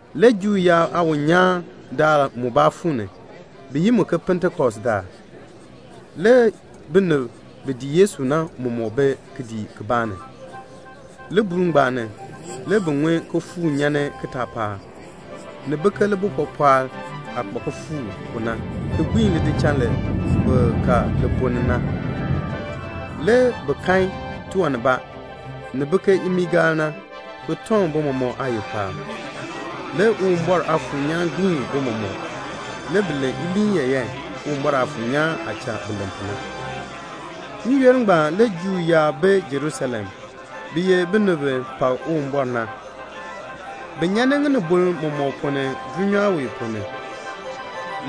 Le Juu yaab aawiin nyaan daal mubaa fuu ni. Bi yi mu ke Pentekost daal. Le binib bi dii Yesu na mɔmɔk bi kidiik kibaa ni. Libuul ngbaan ni, le bi ŋun kifuuk nyan ni kitaapaak. Ni bi ke libuln pɔpɔɔl aah kpa kifuuk pu na ki gbiin lidichal li bi ka li ponn ni na. Le bi kan tiwan nibaa, ni bi ke imiigaal na, ki tɔŋ bi mɔmɔk aayil paab. Le Uwumbɔr Aafuur nyaan gbiin bi mɔmɔk. Le bi len iliin yaayan, Uwumbɔr Aafuur nyaan aah cha bi len pu na. N-yoonn ngbaan le Juu yaab bi Jerusalem. Bi ye binib bi pak Uwumbɔr na. Bi nyan ni ŋinibol mɔmɔk ponn ni dulnyaa wee ponn ni.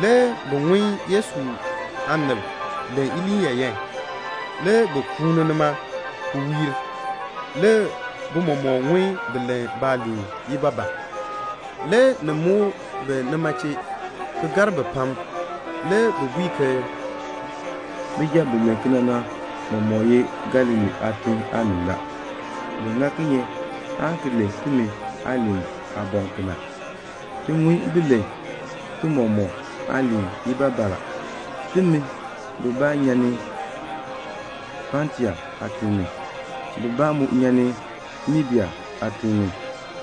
Le bi ŋun Yesu aanib len iliin yaayan. Le bi kuuni nima, ki wiir. Le bi mɔmɔk ŋun bi len baaliin ibaabaa. Le ni muk bi nima chee, ki gar bi pam. Le bi bui ke "Bijab ngbaan bi len kena na, bi mɔmɔk ye Galilee aatiŋ aanib la. Bi ŋa kinye aan ki len timi aaliin aaboŋ kena? Ti ŋun bi len ti mɔmɔk aaliin ibaabaa la. Timi bibaa nyan ni Patia aatiŋ ni, bibaa mu nyan ni Media aatiŋ ni,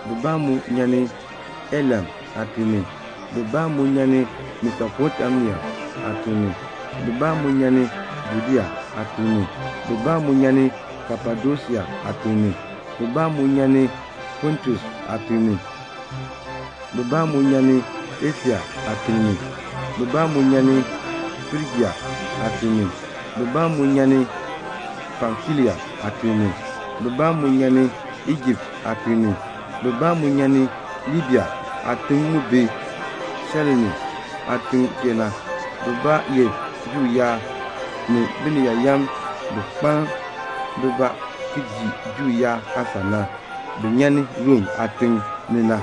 bibaa mu nyan ni Elam aatiŋ ni, bibaa mu nyan ni Mesopotamia aatiŋ ni, bibaa mu nyan ni Judea aatiŋ ni, bibaa mu nyan ni Kapadosia aatiŋ ni, bibaa mu nyan ni Pontus aatiŋ ni, bibaa mu nyan ni Asia aatiŋ ni, bibaa mu nyan ni Frijia aatiŋ ni, bibaa mu nyan ni Pamfilia aatiŋ ni, bibaa mu nyan ni Ijipt aatiŋ ni, bibaa mu nyan ni Libia aatim mu bi Sairene aatiŋ chee na, bibaa ye Juu yaab, ni Biniyaayam bi kpaln bibaa ki dii Juu yaab aasan na, bi nyan ni Rom aatiŋ ni na,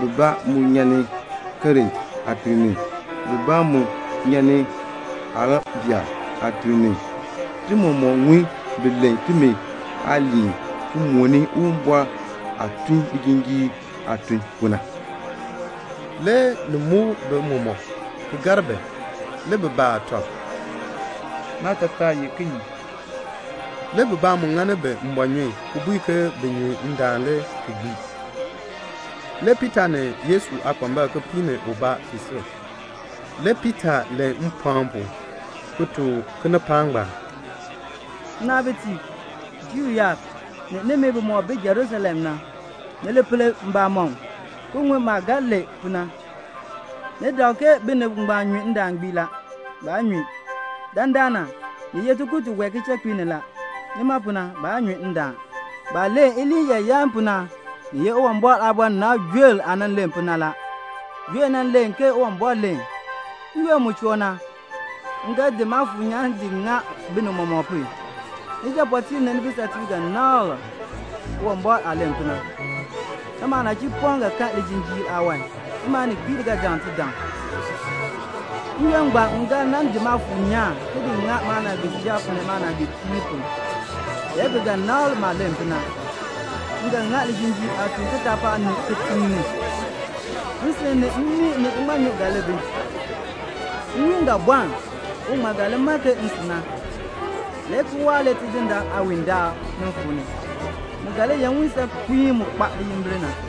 bibaa mu nyan ni Krete aatiŋ ni, bibaa mu nyan ni Arabia aatiŋ ni. Ti mɔmɔk ŋun bi len timi aaliin ki mooni Uwumbɔr aah tun lijinjiir aatun pu na." Le ni muk bi mɔmɔk, ki gar bi. Le bi baa tɔb, "Naatataa ye kinye?" Le bibaa mu ŋani bi mbɔɔnyun ki bui ke bi nyu ndaan le ki gbii. Le Piita ni Yesu aakpambalb kipiik ni ubaa fii sil. Le Piita len mpɔɔn pu, ki tuk kinipaak ngbaan, "Nnaabitiib, Juu yaab, ni nimi bimɔk bi Jerusalem na, ni li pel mbamɔm, ki ŋun maah ga len pu na. Ni dak ke binib ngbaan nyu ndaan gbii la. Baa nyu. Dandana, ni ye tikur tiwae kichakpiik ni la. Nima pu na, baa nyu ndaan. Baah len iliin yaayan pu na, ni ye Uwumbɔr aabɔnabr Joel aah nan len pu na. Joel nan len ke Uwumbɔr len: 'N-yoonn mu choo na, m ga di Maafuur nyaan di ŋa binib mɔmɔk pu. Nijapɔɔteeb ni nibisatiib ga nabr Uwumbɔr aah len pu na. Nimi aanachipɔm ga kan lijinjiir aawan. Nimi aaninkpiib ga daŋ tidaŋ. N-yoonn ngbaan m ga nan di Maafuur nyaan ki di ŋa maanaagbiijab ni maanaagbiipiib pu, le bi ga nabr maah len pu na. M ga ŋa lijinjiir aatun kitaapaak ni, ni kitiŋ ni; nsin ni mmii ni iŋmanyu ga li bi; nwiin ga bɔln, uŋmal ga li mann ke nsin na, le ki waahr le Tidindaan Uwumbɔr aawiin daal nin fuu ni. Mu ga li ye nwiin saakpiin daal mu kpa liyimbil na.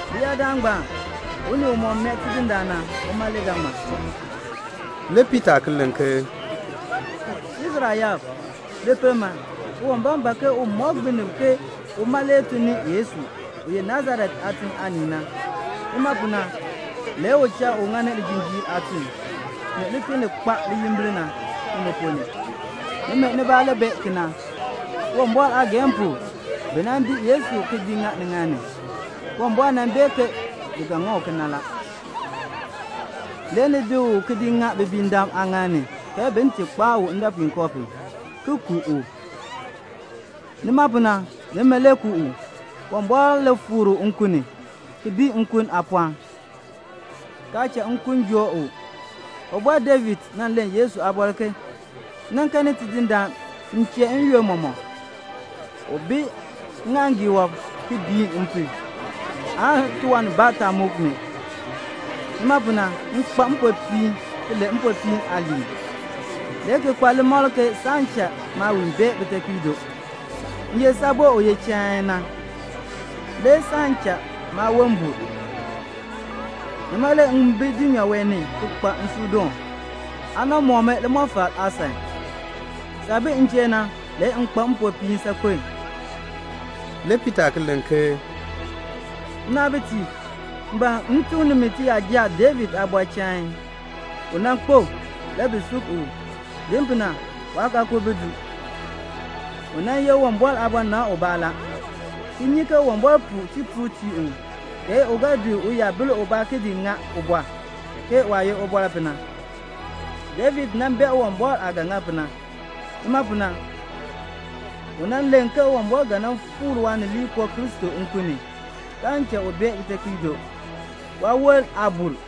Leyaadaal ngbaan, unii umɔk mee Tidindaan na, uma le ga ŋmar."' Le Piita ki len ke, "Israel yaab, li pel man! Uwumbɔr ban ke u mɔk binib ke uma le tun ni Yesu, u ye Nasaret aatiŋ aanii na. Nima pu na le u cha u ŋani lijinjiir aatun, ni lituln li kpa liyimbil na, nimi ponn ni. Nimi nibaa le bee kena. Uwumbɔr aageehn pu le bi nan di Yesu ki di ŋa niŋaal ni. Uwumbɔr nan bee ke bi ga ŋa kena la. Le ni di u ki di ŋa mbiindam aaŋaal ni ke bin ti kpaa u ndɔpuinkoo pu, ki ku u. Nima pu na, nimi le ku u. Uwumbɔr le fikr u nkun ni ki bii nkun aapɔɔn, kaa cha nkun joo u. Ubɔr David nan len Yesu aabɔr ke 'M nan kanni Tidindaan m chee n-yoonn mɔmɔk la. U bi ŋŋaaŋgii wɔb, ki biin m pu la, aan tiwan nibaa taa muk mi. Nima pu na, m kpa mpopiin, ki len mpopiin aaliin; le ki kpa limakl ke saan cha maawiin bee bitekpiido. M ye saabo u ye chain na, le saan cha maawon bur. Nima le m bi dulnyaa wee ni le ki kpa nsuudoon. Aa nan mɔk mi limɔfal aasan. Saah bi m chee na, le m kpa mpopiin saakpen."' Le Piita ki len ke, "Nnaabitiib, m ban m tuk nimi tiyaja David aabɔr chain. U nan kpo. Le bi sub u. Din pu na, waakaakul bi du. U nan ye Uwumbɔr aabɔnabr ubaa la, ki nyi ke Uwumbɔr puu tipuul tii u, ke u ga di uyabil ubaa ki di ŋa ubɔr, ke waah ye ubɔr pu na. David nan bee Uwumbɔr aah ga ŋa pu na. Nima pu na, u nan len ke Uwumbɔr ga nan fikr Waanileekoo Kristo nkun ni, kaan cha u bee bitekpiido. Waawon aa bur.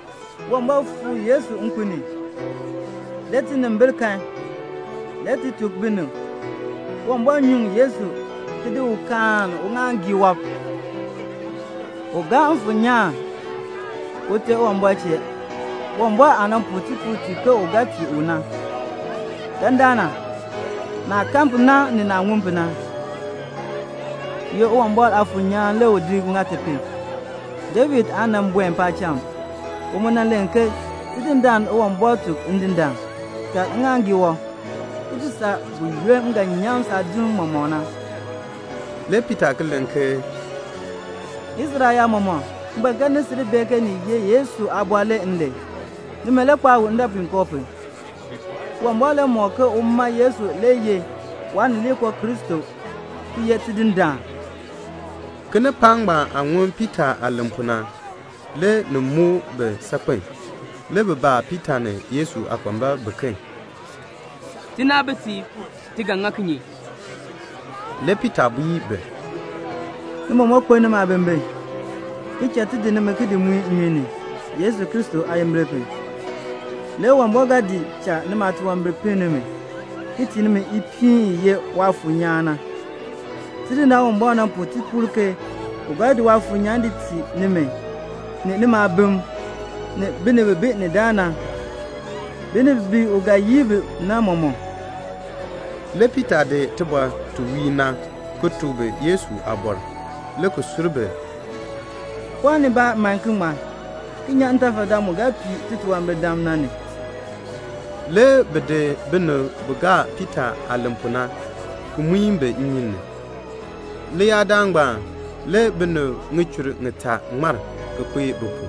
Uwumbɔr fikr Yesu nkun ni. Le tinimbil kan. Le ti tuk binib. Uwumbɔr nyuŋ Yesu, ki di u kaan uŋaaŋgii wɔb. U gaa Mfuur nyaan Ute Uwumbɔr chee, Uwumbɔr aah nan puu tipuul ti ke u ga tii u na. Dandana, naah kan pu na, ni naah ŋun pu na, ye Uwumbɔr Aafuur nyaan le u di ŋa ti pu. David aa nan buen paacham. U mu nan len ke 'Tidindaan Uwumbɔr tuk Ndindaan: Kaln ŋŋaaŋgii wɔb, ki ti saa buyoonn m ga nyaŋ saadim mɔmɔk na."' Le Piita ki len ke, "Israel yaab mɔmɔk, m ban ke ni sil bee ke ni ye Yesu aabɔr le m len. Nimi le kpaa u ndɔpuinkoo pu. Uwumbɔr le mɔk ke uma Yesu le ye Waanileekoo Kristo, ki ye Tidindaan." Kinipaak ngbaan aah ŋun Piita aah len pu na, le ni muk bi saakpen a. Le bi baa Piita ni Yesu aakpambalb biken, "Tinaabitiib, ti ga ŋa kinye?" Le Piita bui bi, "Ni mɔmɔk kpeln nimi aabimbin, ki cha ti di nimi ki di muin nimi nnyun ni, Yesu Kristo aayimbil pu. Le Uwumbɔr ga di cha nimi aatunwambir pinn nimi, ki tii nimi ipiin, i ye Waafuur nyaan na. Tidindaan Uwumbɔr nan puu tipuul ke u ga di Waafuur nyaan di tii nimi, ni nimi aabim, ni binib bi bi ni daa na: binib bi u ga yin bi na mɔmɔk." Le Piita di tibɔr ti wiir na, ki tuk bi Yesu aabɔr, le ki sur bi ki bui bi, "Pɔɔn nibaa man ki ŋmar, ki nyan ntafadaan mu ga pii titunwambirdam ngbaan na ni." Le bi di binib bi gaa Piita aah len pu na, ki muin bi nnyun ni. Leyaadaal ngbaan le binib ŋichur ŋitaa ŋmar, ki kpee bi pu.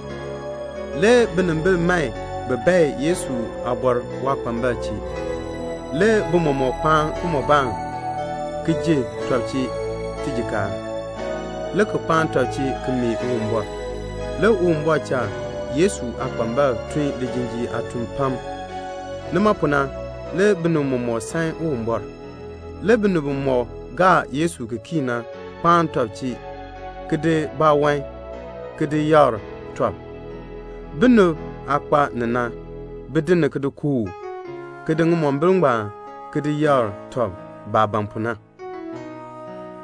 Le binimbil man bin bae Yesu aabɔr waakpambalb chee. Le bi mɔmɔk kpaan kimɔbaan, ki ji tɔb chee tijikaar, le ki kpaan tɔb chee ki mee Uwumbɔr. Le Uwumbɔr cha Yesu aakpambalb tun lijinjiir aatun pam. Nima pu na, le binib mɔmɔk san Uwumbɔr. Le binib bimɔk gaa Yesu ki kii na kpaan tɔb chee, ki di baawan ki di yakr tɔb. Binib aah kpa ni na, bi di ni ki di kooh, ki di ŋimombil ngbaan ki di yakr tɔb, baah ban pu na.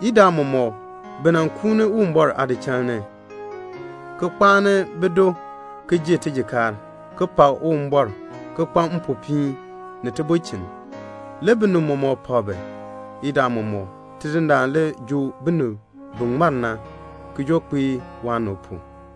Idaa mɔmɔk bi nan kuuni Uwumbɔr aadichal ni, ki kpaani bido ki ji tijikaar, ki pak Uwumbɔr, ki kpa mpopiin, ni tibulchin. Le binib mɔmɔk pak bi. Idaa mɔmɔk Tidindaan le joo binib bi ŋmar na, ki joo kpae waanib pu.